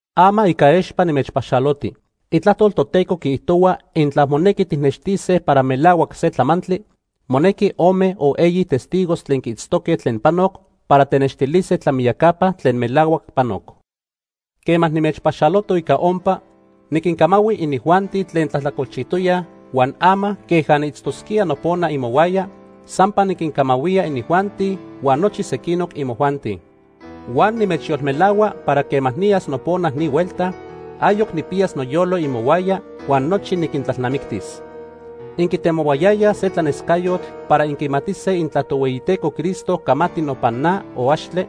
Ama ica expa nimechpaxaloti. Itlajtol Toteco quiijtohua intla monequi tijnextise para melahuac se tlamantli, monequi ome o eyi testigos tlen quiitztoque tlen panoc para tenextilise tlamiyacapa tlen melahuac panoc. Quema nimechpaxaloto ica ompa, niquincamahui inijuanti tlen tlajtlacolchijtoyaj, huan ama, queja niitztosquía nopona imohuaya, sampa niquincamahuía inijuanti huan nochi sequinoc imojuanti. Huan nimechyolmelahua para quema niyas nopona ni huelta, ayoc nijpiyas noyolo imohuaya huan nochi niquintlalnamictis. Inquitemohuayayaj se tlanescayotl para inquimatise intla Tohueyiteco Cristo camati nopan na o axtle,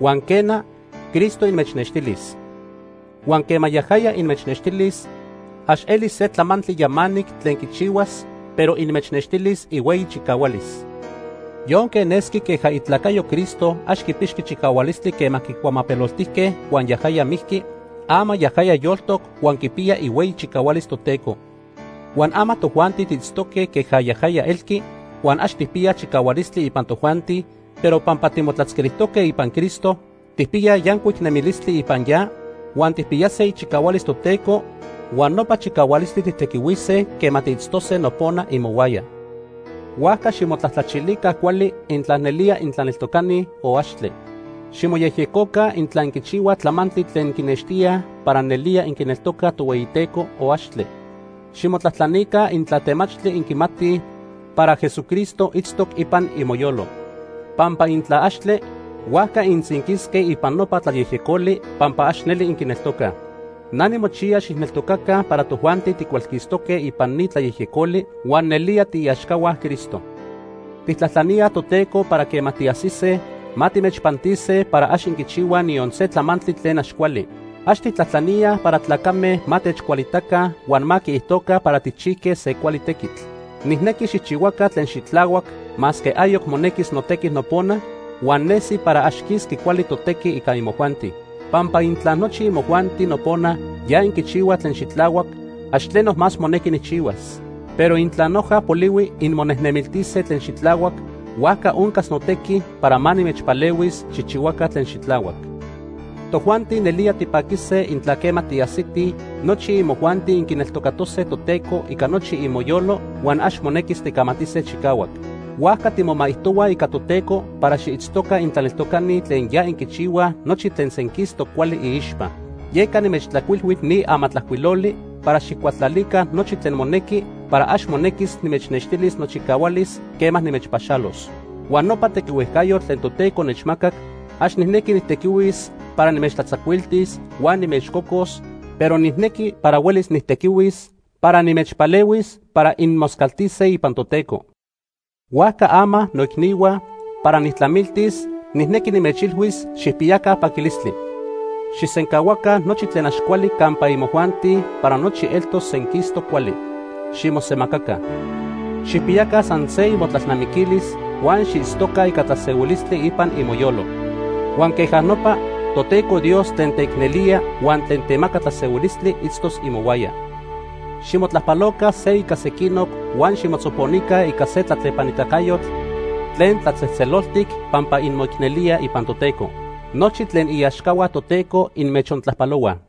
huan quena, Cristo inmechnextilis. Huan quema yajaya inmechnextilis ax elis se tlamantli yamanic tlen quichihuas, pero inmechnextilis ihueyi chicahualis. Yonque nesqui queja itlacayo Cristo ax quipixqui chicahualistli quema quicuamapeloltijque huan yajaya mijqui, ama yajaya yoltoc huan quipiya ihueyi chicahualis Toteco. Huan ama tojuanti tiitztoque queja yajaya elqui huan ax tijpiyaj chicahualistli ipan tojuanti, pero pampa timotlatzquilijtoque ipan Cristo, tijpiyaj yancuic nemilistli ipan ya, huan tijpiyase ichicahualis Toteco huan nopa chicahualistli tijtequihuise quema tiitztose nopona imohuaya. Huajca ximotlajtlachilica cuali intla nelía intlaneltocani o axtle. Ximoyejyecoca intla inquichihuaj tlamantli tlen quinextíaj para nelía inquineltocaj Tohueyiteco o axtle. Ximotlajtlanica intla temachtli inquimatij para Jesucristo itztoc ipan imoyolo. Pampa intla axtle, huajca intzinquisque ipan nopa tlayejyecoli pampa ax neli inquineltocaj. Na nimochiya xijneltocaca para tojuanti ticualquistoque ipan ni tlayejyecoli huan nelía tiiaxcahua Cristo. Tijtlajtlaníaj Toteco para quema tiajsise, ma timechpantise para ax inquichihuaj niyon se tlamantli tlen ax cuali. Ax tijtlajtlaníaj para tlacame ma techcualitaca huan ma quiijtoca para tijchijque se cuali tequitl. Nijnequi xijchihuaca tlen xitlahuac masque ayoc monequis notequi nopona huan nesi para ax quisqui cuali totequi ica imojuanti. Pampa intla nochi imojuanti nopona ya inquichihuaj tlen xitlahuac, ax tleno más monequi nijchihuas. Pero intla noja polihui inmonejnemiltise tlen xitlahuac, huajca oncas notequi para ma nimechpalehuis xijchihuaca tlen xitlahuac. Tojuanti nelía tipaquise intla quema tiajsitij, nochi imojuanti inquineltocatose Toteco ica nochi imoyolo huan ax monequis ticamatise chicahuac. Huajca timomaijtohuaj ica Toteco para xiitztoca intlaneltocani tlen ya inquichihuaj nochi tlen senquistoc cuali iixpa. Yeca nimechtlajcuilhui ni amatlajcuiloli para xijcualtlalica nochi tlen monequi para ax monequis nimechnextilis nochicahualis quema nimechpaxalos. Huan nopa tequihuejcayotl tlen Toteco nechmacac, ax nijnequi nijtequihuis para nimechtlatzacuiltis huan nimechcocos, pero nijnequi para huelis nijtequihuis para nimechpalehuis para inmoscaltise ipan Toteco. Huajca ama, noicnihua, para nijtlamiltis nijnequi nimechilhuis xijpiyaca paquilistli. Xijsencahuaca nochi tlen ax cuali campa imojuanti para nochi eltos senquistoc cuali. Ximosemacaca. Xijpiyaca san se imotlalnamiquilis huan xiitztoca ica tlasehuilistli ipan imoyolo. Huan queja nopa, Toteco Dios tlen teicnelía huan tlen temaca tlasehuilistli itztos imohuaya. Ximotlajpaloca se ica sequinoc huan ximotzoponica ica se tlatlepanitacayotl tlen tlatzejtzeloltic pampa inmoicnelíaj ipan Toteco. Nochi tlen iaxcahua Toteco inmechontlajpalohuaj.